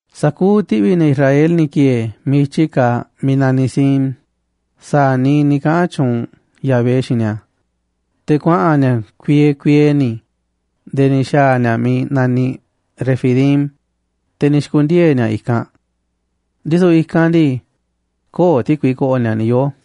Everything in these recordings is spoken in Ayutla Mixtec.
Sa̱kuuꞌ ti̱ꞌvi̱ ne̱ Israel ni̱ ki̱e̱e̱ miiꞌ i̱tyi kaaꞌ miiꞌ naniꞌ Sin sa̱a̱ niiꞌ ni̱ kaꞌa̱n tyuunꞌ Yahvé xiinꞌ ni̱a̱, te̱ kuaꞌa̱n ni̱a̱ kuiee kuiee ni̱ nde̱e̱ ni̱ xa̱a̱ ni̱a̱ miiꞌ naniꞌ Refidim, te̱ ni̱ xi̱ku̱ndiee̱ ni̱a̱ i̱kanꞌ. Ndisu̱ i̱kanꞌ ndii, köo̱ꞌ ti̱kui ko̱ꞌo̱ ni̱a̱ ni̱ yoo̱.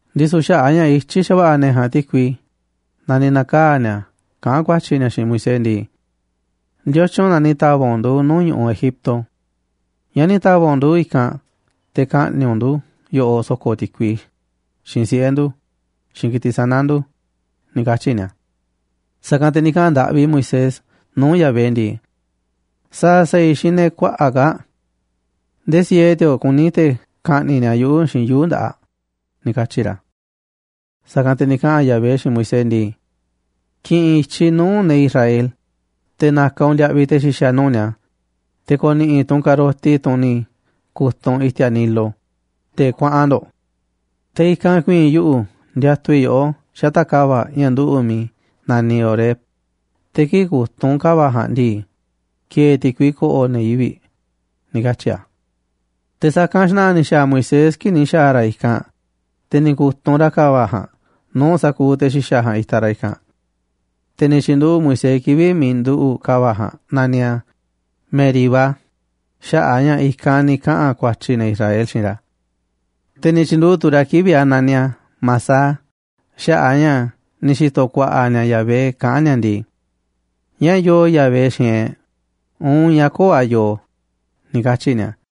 Ndisu̱ xaꞌa̱ꞌ a̱ ña̱ ityí xa̱va̱ꞌa̱ ne̱ ja̱a̱nꞌ ti̱kui na ni̱ na̱kaa̱ ni̱a̱ kaꞌán ku̱a̱tyi̱ ni̱a̱ xiinꞌ Moisés ndii: ―¿Ndiotyun na ni̱ ta̱va̱ꞌ u̱nꞌ ndu̱ nuu̱ꞌ ñu̱ꞌuꞌ Egipto? ¿Ñáá ni̱ ta̱va̱ꞌ u̱nꞌ ndu̱ i̱kanꞌ te̱ ka̱ꞌni̱ꞌ u̱nꞌ ndu̱ yoꞌoꞌ so̱ko̱ ti̱kui, xiinꞌ siꞌe̱ ndu̱, xiinꞌ ki̱tiꞌ sana̱ ndu̱? ―ni̱ katyi̱ ni̱a̱. Sa̱kanꞌ te̱ ni̱ kaꞌa̱n ndaꞌvi Moisés nuu̱ꞌ Yahvé ndii: ―¿Sa̱a̱ sa̱a̱ i̱ xiinꞌ ne̱ kuaꞌa̱ꞌ kaa̱ꞌ? Ndee siee ti̱o̱ꞌ kuní te̱ ka̱ꞌni̱ꞌ ni̱a̱ yuꞌu̱ xiinꞌ yuu̱ꞌ nda̱ꞌaꞌ ― ni̱ katyi̱ ra̱. Sa̱kanꞌ te̱ ni̱ kaꞌa̱n Yahvé xiinꞌ Moisés ndii: ―Ki̱ꞌi̱n i̱tyiꞌ nuu̱ꞌ ne̱ Israel, te̱ na̱ka̱ u̱nꞌ ndiaꞌviꞌ te̱ xi̱xa̱ nuu̱ꞌ ni̱a̱, te̱ ko̱ni̱ꞌi̱ tu̱ u̱nꞌ ka̱roti, tunꞌ ni̱ ku̱tunꞌ u̱nꞌ i̱ti̱a̱ Nilo, te̱ kuaꞌan ndo̱ꞌ. Te̱ i̱kanꞌ ku̱i̱i̱n yuꞌu̱ ndiatuꞌ i̱ yoꞌó xata̱ꞌ ka̱va̱ꞌ ña̱ nduꞌu̱ꞌ miiꞌ naniꞌ Horeb, te̱ kii̱ꞌ ku̱tunꞌ u̱nꞌ ka̱va̱ꞌ ja̱a̱nꞌ ndii, ki̱e̱e̱ ti̱kui ko̱ꞌo̱ ne̱ yivi̱ꞌ ―ni̱ katyi̱ a̱. Te̱ sa̱kanꞌ xna̱ꞌa̱ ni̱ xa̱a̱ Moisés kii̱ꞌ ni̱ xa̱a̱ ra̱ i̱kanꞌ, te̱ ni̱ ku̱tunꞌ ra̱ ka̱va̱ꞌ ja̱a̱nꞌ nuu̱ꞌ sa̱kuuꞌ te̱ xi̱xa̱ ja̱a̱nꞌ itaꞌ ra̱ i̱kanꞌ. Te̱ ni̱ tyi̱nduꞌu̱ꞌ Moisés kivi̱ꞌ miiꞌ nduꞌu̱ꞌ ka̱va̱ꞌ ja̱a̱nꞌ naniꞌ a̱ Meribá xaꞌa̱ꞌ a̱ ña̱ i̱kanꞌ ni̱ kaꞌa̱n ku̱a̱tyi̱ ne̱ Israel xiinꞌ ra̱. Te̱ ni̱ tyi̱nduꞌu̱ꞌ tu̱ ra̱ kivi̱ꞌ a̱ naniꞌ a̱ Masah xaꞌa̱ꞌ a̱ ña̱ ni̱ xi̱to̱ ku̱a̱ꞌa̱ ni̱a̱ Yahvé kaꞌán ni̱a̱ ndii: “¿Ñáá yoo Yahvé xiinꞌ e̱ꞌ uun ñáá köo̱ꞌ a̱ yoo?”, ni̱ katyi̱ ni̱a̱.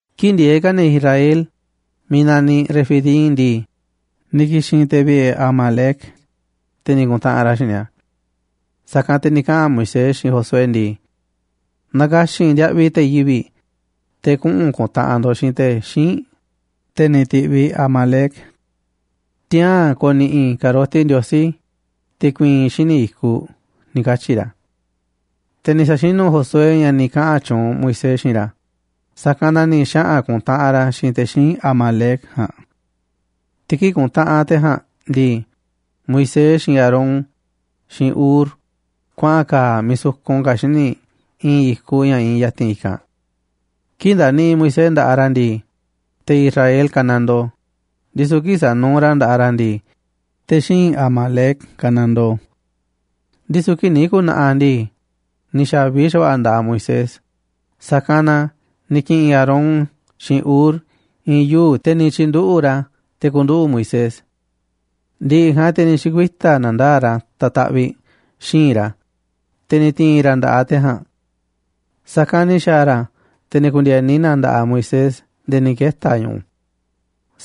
Kii̱ꞌ ndieeꞌ ka̱ ne̱ Israel miiꞌ naniꞌ Refidim ndii, ni̱ ki̱xi̱n te̱ vi̱ꞌe̱ Amalec, te̱ ni̱ ku̱ntaꞌanꞌ ra̱ xiinꞌ ni̱a̱. Sa̱kanꞌ te̱ ni̱ kaꞌa̱n Moisés xiinꞌ Josué ndii: ―Na̱ka̱xi̱n ndiaꞌviꞌ te̱ yivi̱ꞌ, te̱ kuꞌu̱n ku̱ntaꞌanꞌ ndo̱ꞌ xiinꞌ te̱ xíinꞌ, te̱ ni̱ ti̱ꞌviꞌ Amalec. Tiaa̱n ko̱ni̱ꞌi̱ i̱ ka̱roti Ndiosí te̱ ku̱i̱i̱n i̱ xíniꞌ i̱kuꞌ ―ni̱ katyi̱ ra̱. Te̱ ni̱ sa̱xinu̱ Josué ña̱ ni̱ kaꞌa̱n tyuunꞌ Moisés xiinꞌ ra̱, sa̱kanꞌ na ni̱ xaꞌa̱n ku̱ntaꞌanꞌ ra̱ xiinꞌ te̱ xíinꞌ Amalec ja̱a̱nꞌ. Te̱ kii̱ꞌ kuntaꞌanꞌ te̱ ja̱a̱nꞌ ndii, Moisés, xiinꞌ Aarón, xiinꞌ Hur kuaꞌa̱n ka̱a̱ miiꞌ sukun ka̱ xíniꞌ i̱i̱n i̱kuꞌ ña̱ iinꞌ ya̱ti̱n i̱kanꞌ. Kii̱ꞌ ndaniꞌiꞌ Moisés nda̱ꞌaꞌ ra̱ ndii, te̱ Israel kanandoo, ndisu̱ kii̱ꞌ sanuuꞌ ra̱ nda̱ꞌaꞌ ra̱ ndii, te̱ xíinꞌ Amalec kanandoo. Ndisu̱ kii̱ꞌ ni̱ ku̱na̱ꞌaꞌ ndii, ni̱ xa̱vi xa̱va̱ꞌa̱ nda̱ꞌaꞌ Moisés, sa̱kanꞌ na ni̱ ki̱ꞌi̱n Aarón xiinꞌ Hur i̱i̱n yuu̱ꞌ, te̱ ni̱ tyi̱nduꞌu̱ꞌ ra̱ a̱ te̱ ku̱nduꞌu̱ꞌ Moisés. Ndi̱ꞌi̱ ja̱a̱nꞌ, te̱ ni̱ xi̱kuita̱ na̱ndaa̱ꞌ ra̱ ta̱taꞌviꞌ xi̱i̱nꞌ ra̱, te̱ ni̱ ti̱i̱n ra̱ nda̱ꞌaꞌ te̱ ja̱a̱nꞌ. Sa̱kanꞌ ni̱ xa̱a̱ ra̱, te̱ ni̱ ku̱ndi̱e̱ni na nda̱ꞌaꞌ Moisés nde̱e̱ ni̱ keta̱ ñu̱ꞌu̱.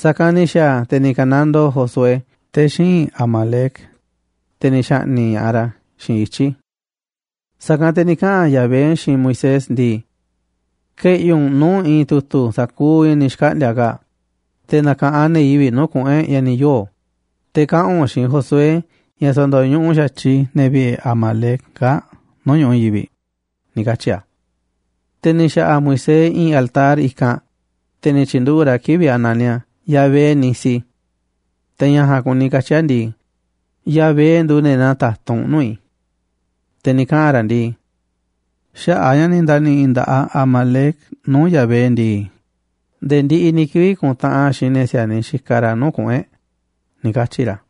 Sa̱kanꞌ ni̱ xa̱a̱ a̱, te̱ ni̱ ka̱nandoo Josué te̱ xíinꞌ Amalec, te̱ ni̱ xa̱ꞌni̱ꞌ ña̱ꞌaꞌ ra̱ xiinꞌ ityi̱. Sa̱kanꞌ te̱ ni̱ kaꞌa̱n Yahvé xiinꞌ Moisés ndii: ―Ke̱ꞌi̱ u̱nꞌ nuu̱ꞌ i̱i̱n tu̱tu̱ sa̱kuuꞌ ña̱ ni̱ xkaꞌndi̱a̱ kaa̱ꞌ, te̱ na̱ka̱ꞌanꞌ ne̱ yivi̱ꞌ nuu̱ꞌ kuꞌu̱n e̱ꞌ ña̱ ni̱ yoo̱. Te̱ kaꞌa̱n u̱nꞌ xiinꞌ Josué ña̱ sa̱ndo̱ñuꞌuꞌ xa̱tyiꞌ i̱ ne̱ vi̱ꞌe̱ Amalec kaa̱ꞌ nuu̱ꞌ ñu̱ꞌuꞌ i̱i̱n yivi̱ꞌ ―ni̱ katyi̱ a̱. Te̱ ni̱ xa̱ꞌa̱ Moisés i̱i̱n altar i̱kanꞌ, te̱ ni̱ tyi̱nduꞌu̱ꞌ ra̱ kivi̱ꞌ a̱ naniꞌ a̱ Yahvé-nisi. Te̱ ña̱ ja̱a̱nꞌ kuni katyi̱ a̱ ndii: Yahvé nduuꞌ nde̱e̱ naa ta̱tunꞌ nuu̱ꞌ i̱. Te̱ ni̱ kaꞌa̱n ra̱ ndii: ―Xaꞌa̱ꞌ a̱ ña̱ ni̱ nda̱ni̱ꞌi̱ nda̱ꞌaꞌ Amalec nuu̱ꞌ Yahvé ndii, nde̱e̱ ndiꞌiꞌ ni̱ kivi̱ꞌ ku̱ntaꞌanꞌ a̱ xiinꞌ ne̱ si̱a̱niꞌ xikaꞌ ra̱ nuu̱ꞌ kuꞌu̱n e̱ꞌ ―ni̱ katyi̱ ra̱.